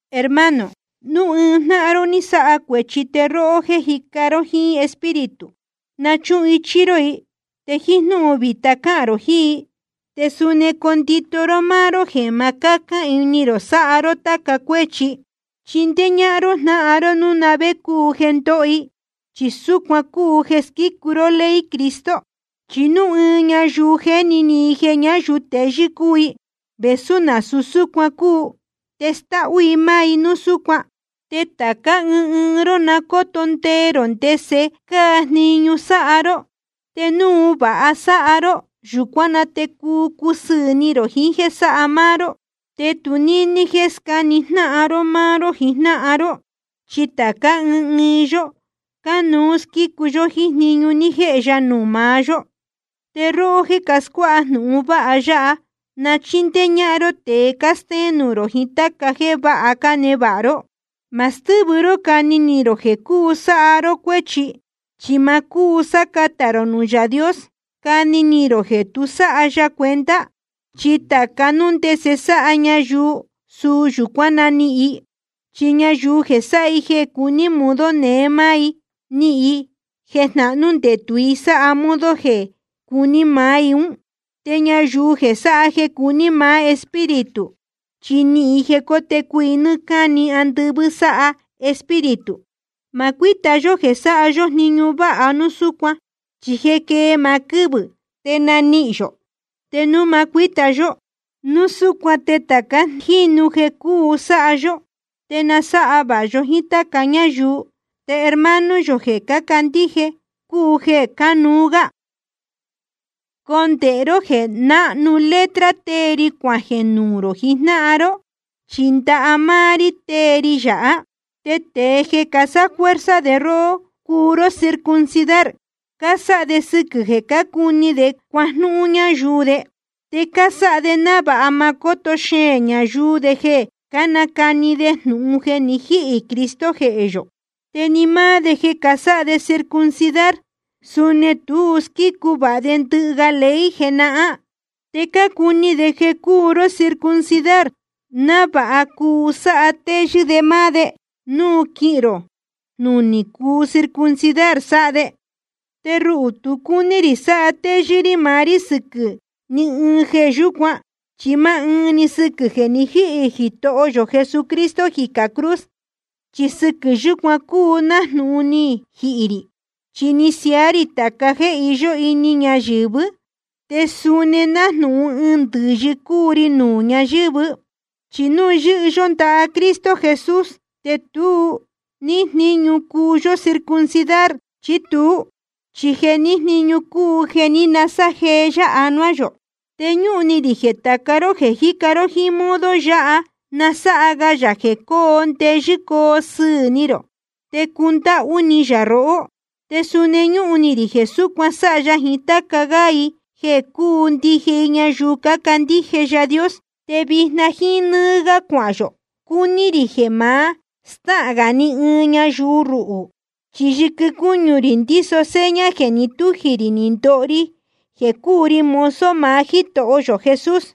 Hermano, núu ɨɨn jnáhan ró ni sáha cuēchi, te róhó jéē cájica jíín Espíritu, na náchuhun ichí ró i. Te jíín jnúhun vītá cahān rō jiín i, te suni condito ró máá ró jeē ma cacán ini rō sáha ró táca cuéchi. Te chindéé ñáhán ró jnáhan ró núu na vé cúu jeē ndóho i, chi súcuan cúu jeē squícu ró ley Cristo. Chi núu ɨɨn ñayuu jéni ni i jeē ñáyuu teyɨ́ cúu i, vēsú nasūu súcuan cúu, te stáhú i máá i núu súcuan. Te tācá ɨɨn ɨɨn ró na cóto ndee rō ndese cáa jniñu sáha ró. Te núu vāha sáha ró, yūcuán na te cuu cusɨɨ̄ ni rō jiín jéē sáha máá ró, te tu níní jéē scáni jnáhan ró máá ró jiín jnáhan ró. Chi tācá ɨɨn ɨɨn yó cánuú squícu yó jíín jniñu ní jéhe ya nuū maá yó. Te róhó jéē cascuáha jnūhun vāha ya, na chíndéé ñáhán ró tēe cástéén nuū rō jiín táca jéē váha cánevāha ró. Ma stɨ́vɨ ró cani ni rō jeē cuu sáha ró cuéchi. Chi ma cúu sácatā rō nuū Yaā Dios cani ni rō jeē tu sáha ya cuenta. Chi tāca núu ndese sáha ñayuu, suu yūcuán nanihīn i. Chi ñayuu jeē sáha i jeē cuní modo neé máá i, nihīn i jeē jnahnú ndetū i sáha modo jeē cuní maá i ún. Te ñayuu jeē sáha jeē cuní maá Espíritu, chi nihīn i jeē cótecu i nɨ́ɨ́ cáni andɨvɨ́ sáha Espíritu. Te ma cuíta yó jeē sáha yó jniñu váha núu súcuan, chi jeē quée maá quɨ́vɨ̄ te nanihīn yō, te núu ma cuíta yó. Núu súcuan te tāca jínu jeē cúu sáha yó, te na sáha vāha yó jíín táca ñáyuu, te hermano yō jeē cácandíje cúu jeē cánuú gá. Condēhe ró jeē náhnu letra tée ri cuajeē nuū rō jijnáhan ró, chi ndaha máá rí tée ri yāhá. Te tēe jeē casáfuerza de róhó cuu ró circuncidar, cásáha de sɨquɨ̄ jeē cácuni de cuajnúhún ñáyuu de. Te cásáha de návāha ma cóto xeēn ñayuu de jeē cánacani de jnūhun jeē ni jíhī Cristo jehē yō. Te ni máá de jeē casáha de circuncidar, suni tu squícu vāha de ndɨhɨ ga ley jenahán. Te cácuni de jeē cuu ró circuncidar, návāha cuu sátéyɨ́ de máá de núu quihin ró jnúnī circuncidar sáha de. Te ruhū tu cúní rī satéyɨ́ rí maá rí sɨquɨ̄ ní ɨɨn jeē yúcuan, chi máá ɨɨn‑ni sɨquɨ̄ jeē ni jíhī Jitoho yō Jesucristo jicā cruz. Chi sɨquɨ̄ yūcuan cúu nájnūhun ni jihī rī, chi ni siaá rī tāca jéē iyó ini ñayɨ̄vɨ́, te suni nájnūhun ɨɨn ndɨ̄yɨ cúu ri nuū ñayɨ̄vɨ́. Chi núu yɨ́hɨ yó ndaha Cristo Jesus, te tu níhín jníñu núu cúu yó circuncidar chí tuú. Chi jeē níhín jníñu cúu jeē ní nasájeé yá anuá yō. Te ñúhun ni rī jeē tāca ró jeē jíca ró jíín modo yáha, na sáha ga yā jeē coo ndeyɨ́ coo sɨɨ̄ ni rō, te cundáhú ni yā rohó. Te suni ñúhun ni rī jeē súcuan sáha ya jiín táca gá i jeē cúu ndije i ñayuu cácandíje Yaā Dios. Te vijna jíín nɨ́ɨ́ gá cuahān yō, cúní rī jeē ma stáhān gā ni ɨɨn ñayuu ruhū. Chi yɨquɨ cúñu rī ndíso seña jeē ni tújī rī ni ndoho ri jeē cúu ri mozo maá Jítoho yō Jesús.